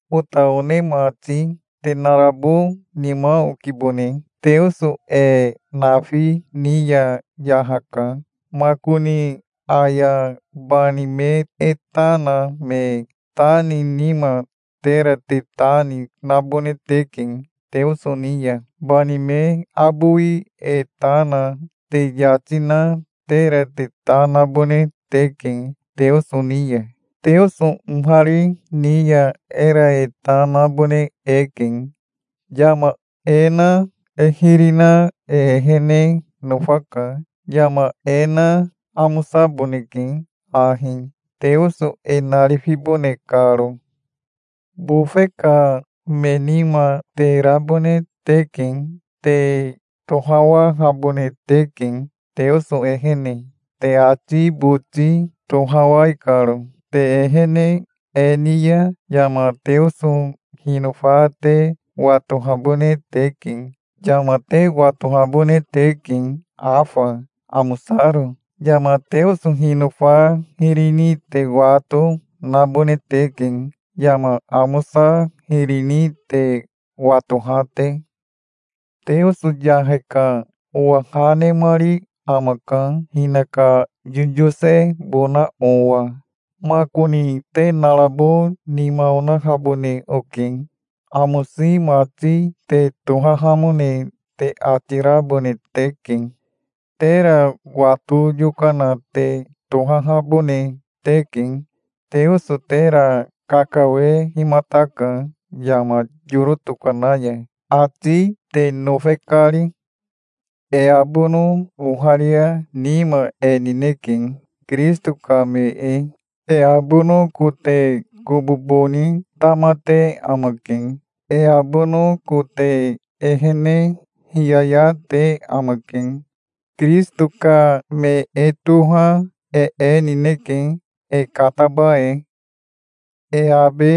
Ota one mati, te narabo nima okibone. Teoso e nafi ni ya yahaka. Makoni aya bani me e ta na me ta ni nima, tera te ta ni nabone teke Teoso ni ya. Bani me abowi e ta na te yati na tera te ta nabone teke Teoso ni ya. Teoso ohari ni ya era e ta nabone eke. Yama e na e hiri na e ehene nofaka. Yama e na amosaboneke ahi, Teoso e narifibone karo. Bofe ka me nima te rabone teke. Te tohawahabone teke, Teoso ehene, te ati boti tohawai karo. Te ehene e ni ya yama Teoso hinofa te watohabone teke. Yama te watohabone teke afa, amosaro. Yama Teoso hinofa hiri ni te wato nabone teke, yama amosa hiri ni te watoha te. Teoso yahe ka owa ha nemari amaka hinaka yoyosebona owa. Makoni te narabo nima onahabone oke. Amosi mati te tohahamone te ati rabone teke. Tera wato yokana te tohahabone teke. Teoso tera kakawehimataka yama yoro tokana ya, ati te nofe kari. E abono oharia nima e nineke, Kirisito ka me e. E abono kote kobobo ni tamate amake. E abono kote ehene hiyaya te amake. Kirisito ka me e toha e e nineke, e kataba e. E abe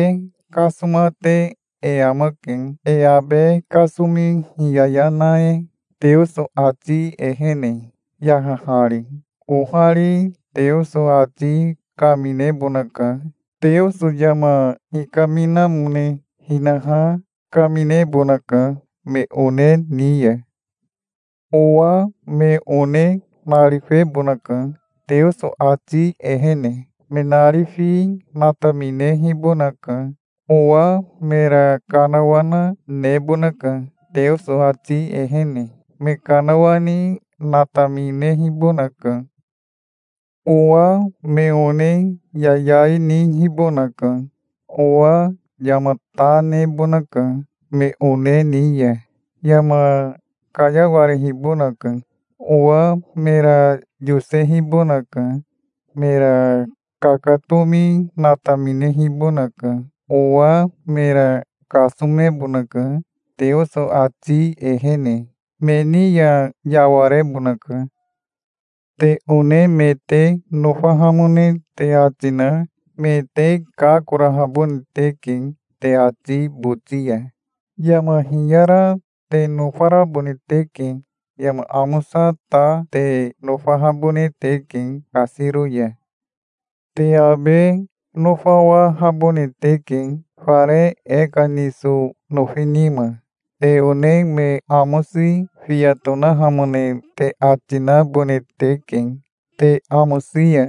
kasomate e amake, e abe kasomi hiyaya na e, Teoso ati ehene, yahahari. Ohari Teoso ati kaminebonaka. Teoso yama hikaminamone hinaha kaminebonaka me one ni ya. Owa me one narifebonaka, Teoso ati ehene. Me narifi nataminehibonaka. Owa mera kanawana nebonaka, Teoso ati ehene. Me kanawani nataminehibonaka. Owa me one yayai nihibonaka. Owa yama ta nebonaka me one ni ya. Yama kayawarehibonaka. Owa mera yosehibonaka. Mera kakatomi nataminehibonaka. Owa mera kasomebonaka Teoso ati ehene. Me ni ya yawarebonaka. Te one me te nofahamone te ati na me te kakorahabone teke te ati boti ya. Yama hiyara te nofarabone teke. Yama amosa ta te nofahabone teke kasiro ya. Te abe nofarawahabone teke, fare e ka niso nofi nima. Te one me amosi fiya tonahamone te ati nabone teke, te amosi ya.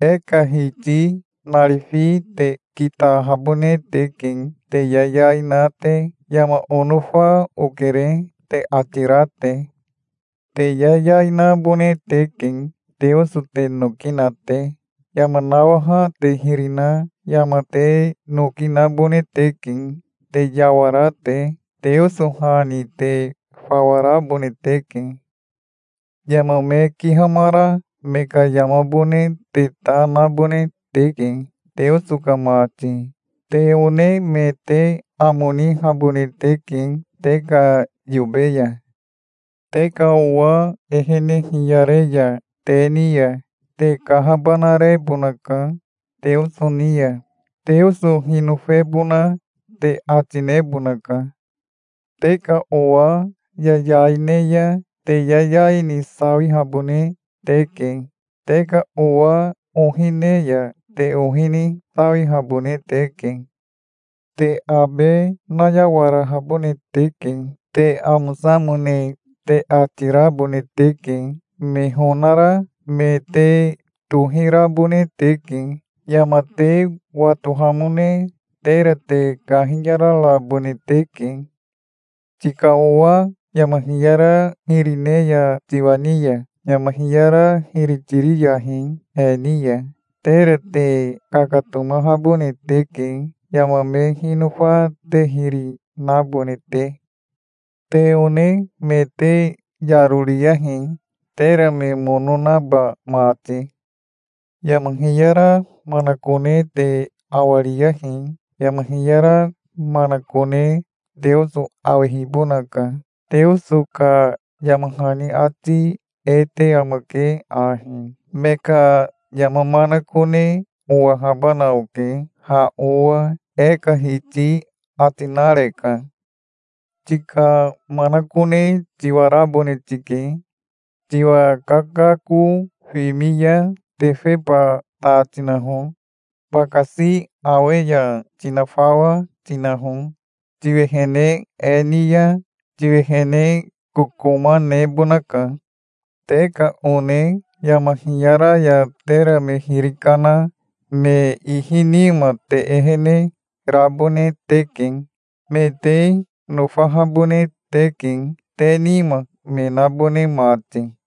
E ka Hiti narifi te kitahabone teke te yayai na te, "Yama onofa okere", te ati ra te. Te yayai nabone teke, Teoso te noki na te. Yama nawaha te hiri na yama te noki nabone teke, te yawara te. Teoso ha ni te fawa rabone teke. Yama me kihamara me ka yamabone te ta nabone teke, Teoso ka mati. Te one me te amo nihabone teke te ka yobe ya. Te ka owa ehene hiyare ya te ni ya, te kahabanarebonaka Teoso ni ya. Teoso hinofebona te ati nebonaka. Te ka owa yayai ne ya te yayai ni sawihabone teke. Te ka owa ohi ne ya te ohi ni sawihabone teke. Te abe nayawarahabone teke. Te amosamone te ati rabone teke. Me honara me te tohirabone teke. Yama te watohamone tera te kahiyararabone teke. Tika owa yama hiyara hiri ne ya tiwa ni ya, yama hiyara hiri tiriyahi he ni ya. Tera te kakatomahabone teke, yama me hinofa te hiri nabone te. Te one me te yaro riyahi, tera me mono naba mati. Yama hiyara manakone te awariyahi. Yama hiyara manakone Teoso awehibonaka. Teoso ka yama hani ati e te amake ahi: "Me ka yama manakone owahabana oke ha owa, e ka Hiti ati nareka". Tika manakone tiwarabone tike. Tiwa kakako fimi ya tefeba ta tinaho. Bakasi awe ya tinafawa tinaho. Tiwehene e ni ya tiwehene kokoma nebonaka. Te ka one yama hiyara ya tera me hiri kana me ihi nima te ehene rabone teke. Me te nofahabone teke, te nima me nabone mati.